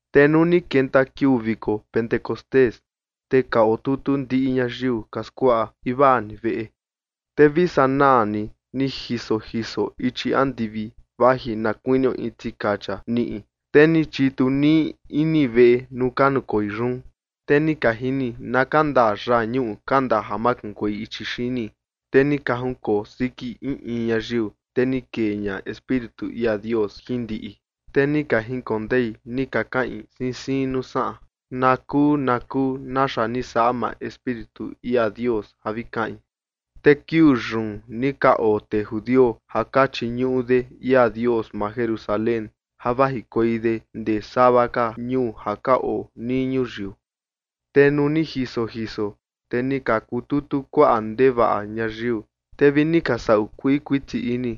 Te nuu ni kenta kiuu viko Pentecostés, te ka otutu ndiꞌi ñayiu ka skuaꞌa invaa ni veꞌe. Te vi sanaa ni, ni jiso jiso ichi andivi vaji na kuinio in tikacha niꞌi, te ni chitu nii ini veꞌe nuu ka nukoi yun. Te ni ka jini na kandaa yañuꞌu kandaa ja makunkuei ichi xini, te ni ka junkoo siki in in ñayiu. Te ni kee ña Espíritu ia Dios jin ndiꞌi, te ni ka jinkondei ni ka kaꞌin siin siin nuu saꞌan, na kuu na kuu naxa ni saꞌa maa Espíritu ia Dios ja vi kaꞌin. Te kiuu yun ni ka oo tee judio ja ka chiñuꞌu de ia Dios maa Jerusalén ja vajikuei de ndee sava ka ñuu ja ka oo nii ñuyiu. Te nuu ni jiso jiso, te ni ka kututu kuaꞌa ndevaꞌa ñayiu, te vi ni ka saꞌu kuii kuiti ini,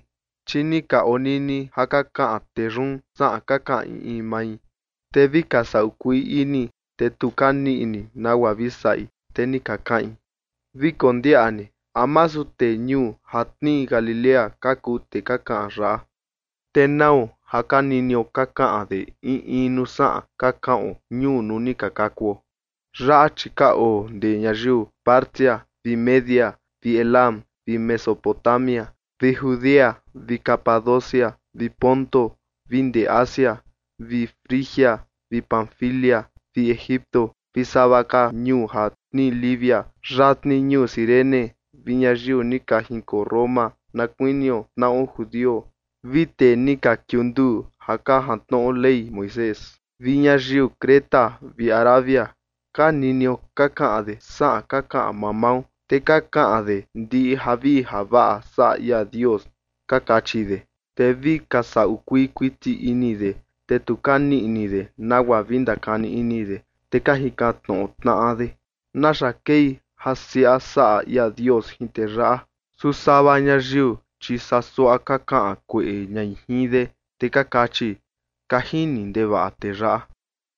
chi ni ka onini ja ka kaꞌan tee yun saꞌan ka kaꞌan in in mai. Te vi ka saꞌu kuii ini, te tu ka niꞌi ini nagua vi saꞌi, te ni ka kaꞌin: ―Vi kondiaꞌa ni, ¿a masu tee ñuu ja tnii Galilea ka kuu tee ka kaꞌan yaꞌa? ¿Te nau ja ka ninio ka kaꞌan de in in nuu saꞌan ka kaꞌon ñuu nuu ni ka kakuo? Yaꞌa, chi ka oo ndee ñayiu Partia vi Media vi Elam vi Mesopotamia vi Judea vi Capadocia vi Ponto vi ndee Asia, vi Frigia vi Panfilia vi Egipto vi sava ka ñuu ja tnii Libia yatni ñuu Cirene vi ñayiu ni ka jinkoo Roma na kuinio tnaꞌo judio vi tee ni ka kiunduu ja ka jantnoꞌo Ley Moisés, vi ñayiu Creta vi Arabia ka ninio ka kaꞌan de saꞌan ka kaꞌan mamao, te ka kaꞌan de ndiꞌi javii javaꞌa saꞌa ia Dios ―ka kachi de. Te vi ka saꞌu kuii kuiti ini de, te tu ka niꞌi ini de nagua vi ndakani ini de, te ka jikan tnoꞌo tnaꞌa de: ―¿Naxa kei ja siaꞌa saꞌa ia Dios jin tee yaꞌa? Su sava ñayiu, chi saa suaꞌa ka kaꞌan kueꞌe ñai jin de, te ka kachi: ―Ka jini ndevaꞌa tee yaꞌa.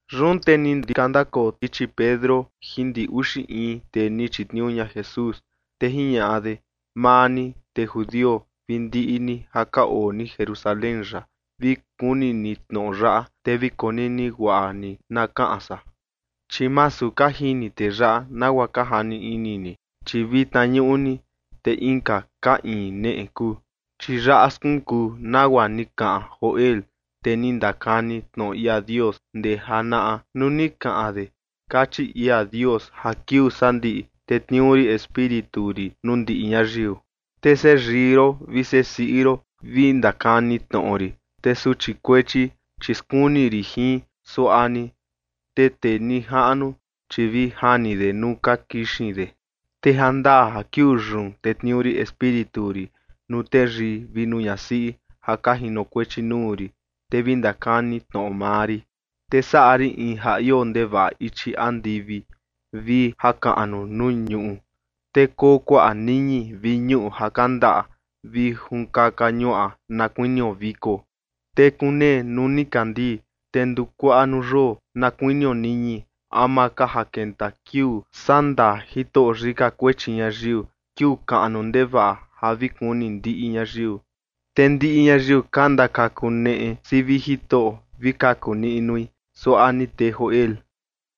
Yun te ni ka ndakoo ndichi Pedro jin ndi uxi in tee ni chitniuu ña Jesús, te jiñaꞌa de: ―Maa ni, tee judio, vi ndiꞌi ni ja ka oo ni Jerusalén yaꞌa, vi kuni ni tnoꞌo yaꞌa, te vi konini guaꞌa ni na kaꞌan san. Chi masu ka jini tee yaꞌa, nagua ka jani ini ni, chi vitna ñuꞌni te inka ka iin neꞌe kuu. Chi yaꞌa skunkuu nagua ni kaꞌan Joel, tee ni ndakani tnoꞌo ia Dios ndee janaꞌa, nuu ni kaꞌan de: Kachi ia Dios ja kiuu sandiꞌi, tetniuu rin Espíritu rin nuu ndiꞌi ñayiu, te seꞌe yii ron vi seꞌe siꞌi ron vi ndakani tnoꞌo rin, te suchi kuechi, chi skuni rin jin, suaꞌa ni, te tee nijaꞌnu, chi vi jani de nuu ka kixin de. Te jandaa ja kiuu yun tetniuu rin Espíritu rin nuu teyii vi nuu ñasiꞌi ja ka jinokuechi nuu rin, te vi ndakani tnoꞌo maa rin. Te saꞌa rin in ja ioo ndevaꞌa ichi andivi vi jakaꞌnu nuu ñuꞌu, te koo kuaꞌa niñi vi ñuꞌu ja kandaꞌa vi junkaka ñuaꞌa na kuinio viko. Te kunee nuu nikandii te nduu kuaꞌa nuu yoo na kuinio niñi ama ka ja kenta kiuu sandaa Jitoꞌo yika kuechi ñayiu kiuu kaꞌnu ndevaꞌa ja vi kuni ndiꞌi ñayiu. Te ndiꞌi ñayiu ka ndakakuneꞌe sivi Jitoꞌo vi kaku niꞌnui suaꞌa ni tee Joel.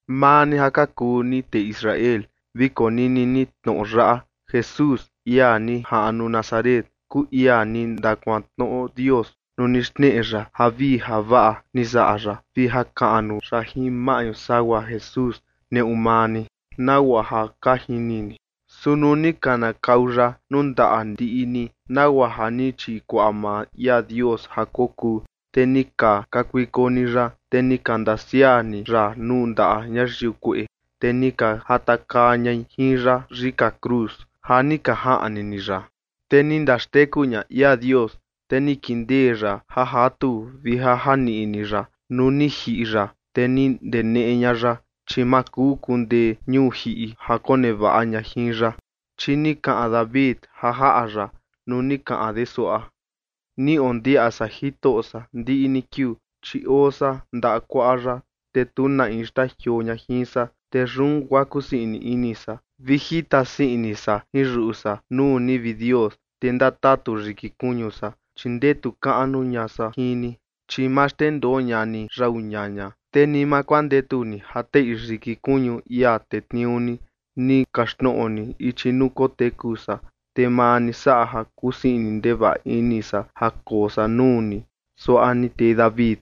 ’Maa ni ja ka kuu ni tee Israel, vi konini ni tnoꞌo yaꞌa: Jesús, ia ni jaꞌnu Nazaret, kuu ia ni ndakuantnoꞌo Dios nuu ni xneꞌe ya javii javaꞌa ni saꞌa ya vi jakaꞌnu ya jin maꞌñu sagua Jesús neꞌu maa ni, nagua ja ka jini ni. Su nuu ni kanakau ya nuu ndaꞌa ndiꞌi ni, nagua ja ni chikuaꞌa maa ia Dios ja kokuu, te ni ka kakuiko ni ya, te ni ka ndasiaꞌa ni ya nuu ndaꞌa ñayiu kueꞌe, te ni ka jatakaa ñai jin ya yika cruz ja ni ka jaꞌni ni ya. Te ni ndaxteku ña ia Dios, te ni kindee ya ja jatu vi ja janiꞌni ya nuu ni jiꞌi ya, te ni ndeneꞌe ña ya, chi ma kuu kundee ñuu jiꞌi ja konevaꞌa ña jin ya. Chi ni kaꞌan David ja jaꞌa ya nuu ni kaꞌan de suaꞌa: Ni ondiaꞌa san Jitoꞌo san ndiꞌi ni kiuu, chi oo san ndaꞌa kuaꞌa ya, te tu na in xtajioo ña jin san. Te yun guaa kusii ini san vi jita sii ini san jin yuꞌu san nuu ni, vi Dios, te ndatatu yiki kuñu san, chi ndetu kaꞌnu ña san jin ni, chi ma xndendoo ña ni yau ñaña, te ni ma kuandetu ni ja teꞌi yiki kuñu ia tetniuu ni. Ni kaxtnoꞌo ni ichi nuu koteku san, te maa ni saꞌa ja kusii ndevaꞌa ini san ja koo san nuu ni suaꞌa ni tee David.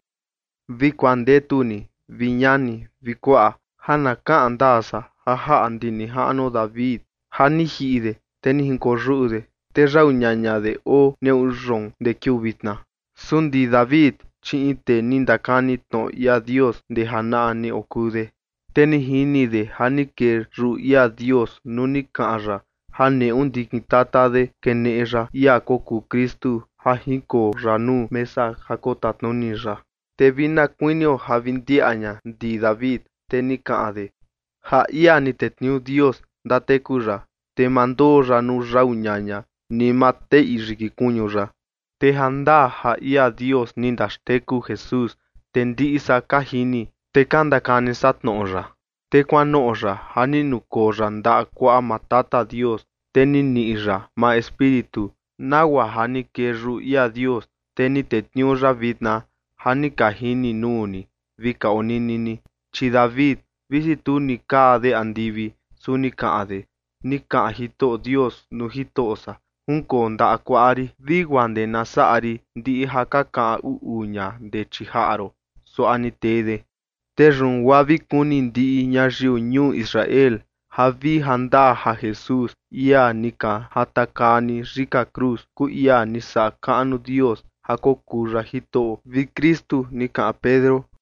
’Vi kuandetu ni, vi ñani vi kuaꞌa, ja na kaꞌan ndaa san ja jaꞌa ndi nijaꞌnuo David, ja ni jiꞌi de, te ni jinkoyuꞌu de, te yau ñaña de oo neꞌu yoon ndee kiuu vitna. Su ndi David, chi in tee ni ndakani tnoꞌo ia Dios ndee janaꞌa ni okuu de. Te ni jini de ja ni kee yuꞌu ia Dios nuu ni kaꞌan ya ja neꞌu ndikin tata de keneꞌe ya ia kokuu Kristu ja jinkoo ya nuu mesa ja kotatnuni ya. Te vi na kuinio ja vi ndiaꞌa ña ndi David, te ni kaꞌan de: Ja ia ni tetniuu Dios ndateku ya, te ma ndoo ya nuu yau ñaña ni ma teꞌi yiki kuñu ya. Te ja ndaa ja ia Dios ni ndaxteku Jesús, te ndiꞌi san ka jini, te ka ndakani san tnoꞌo ya. Te kuanoꞌo ya ja ni nukoo ya ndaꞌa kuaꞌa maa Tata Dios. Te ni niꞌi ya maa Espíritu, nagua ja ni kee yuꞌu ia Dios. Te ni tetniuu ya vitna ja ni ka jini nuu ni vi ka onini ni. Chi David, visi tu ni kaa de andivi, su ni kaꞌan de: Ni kaꞌan Jitoꞌo Dios nuu Jitoꞌo san: “Junkoo ndaꞌa kuaꞌa rin vi guaa ndee na saꞌa rin ndiꞌi ja ka kaꞌan uꞌu ña ndee chii jaꞌa ron”, suaꞌa ni tee de. ’Te yun guaa vi kuni ndiꞌi ñayiu ñuu Israel ja vi jandaa ja Jesús, ia ni ka jatakaa ni yika cruz, kuu ia ni saꞌa kaꞌnu Dios ja kokuu ya Jitoꞌo vi Kristu ―ni kaꞌan Pedro.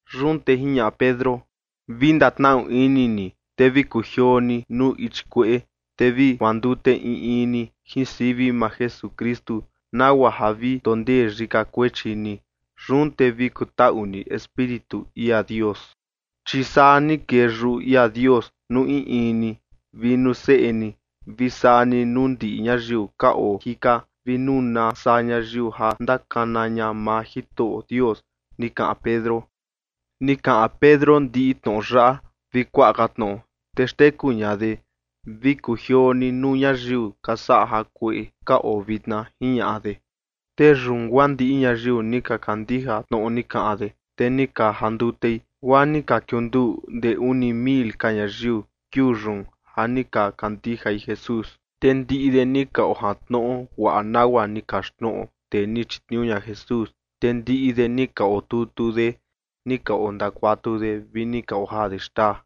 Yun te jiñaꞌa Pedro: ―Vi ndatnaꞌu ini ni, te vi kujioo ni nuu ichi kueꞌe, te vi kuandute in in ni jin sivi maa Jesukristu, nagua ja vi ndondee yika kuechi ni. Yun te vi kutaꞌu ni Espíritu ia Dios. Chi saa ni kee yuꞌu ia Dios nuu in in ni, vi nuu seꞌe ni, vi saa ni nuu ndiꞌi ñayiu ka oo jika, vi nuu na saa ñayiu ja ndakana ña maa Jitoꞌo Dios ―ni kaꞌan Pedro. Ni kaꞌan Pedro ndiꞌi tnoꞌo yaꞌa vi kuaꞌa ka tnoꞌo, te xteku ña de: ―Vi kujioo ni nuu ñayiu ka saꞌa jakueꞌe ka oo vitna ―jiñaꞌa de. Te yun guaa ndiꞌi ñayiu ni ka kandija tnoꞌo ni kaꞌan de, te ni ka jandutei, guaa ni ka kiunduu ndee uni mil ka ñayiu kiuu yun ja ni ka kandijai Jesús. Te ndiꞌi de ni ka jantnoꞌo guaꞌa nagua ni ka kaxtnoꞌo tee ni chitniuu ña Jesús, te ndiꞌi de ni ka otutu de ja ni ka ondakuatu de vi ni ka ojaa de xtaa.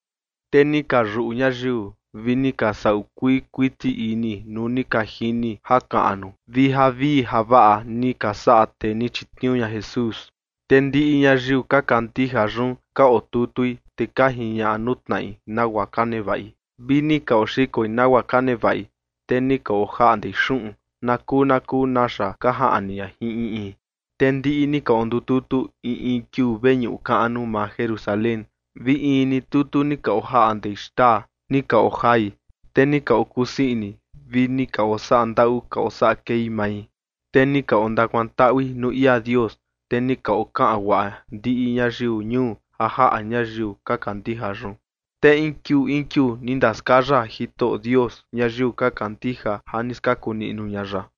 Te ni ka yuꞌu ñayiu vi ni ka saꞌu kuii kuiti ini nuu ni ka jini jakaꞌnu vi javii javaꞌa ni ka saꞌa tee ni chitniuu ña Jesús. Te ndiꞌi ñayiu ka kandija yun ka otutui, te ka jiñaꞌa nuu tnaꞌi nagua ka nevaꞌi, vi ni ka oxikoi nagua ka nevaꞌi, te ni ka ojaꞌndei xuꞌun na kuu na kuu naxa ka jaꞌni ña jin in in. Te ndiꞌi ni ka ondututu in in kiuu veñuꞌu kaꞌnu maa Jerusalén, vi in ni tutu ni ka ojaꞌndei xtaa ni ka ojai, te ni ka okusii ini vi ni ka osaꞌa ndaꞌu ka osaꞌa kei mai. Te ni ka ondakuantaꞌui nuu ia Dios, te ni ka okaꞌan guaꞌa ndiꞌi ñayiu ñuu ja jaꞌa ñayiu ka kandija yun. Te in kiuu in kiuu ni ndaskaya Jitoꞌo Dios ñayiu ka kandija ja ni skaku niꞌnu ña ya.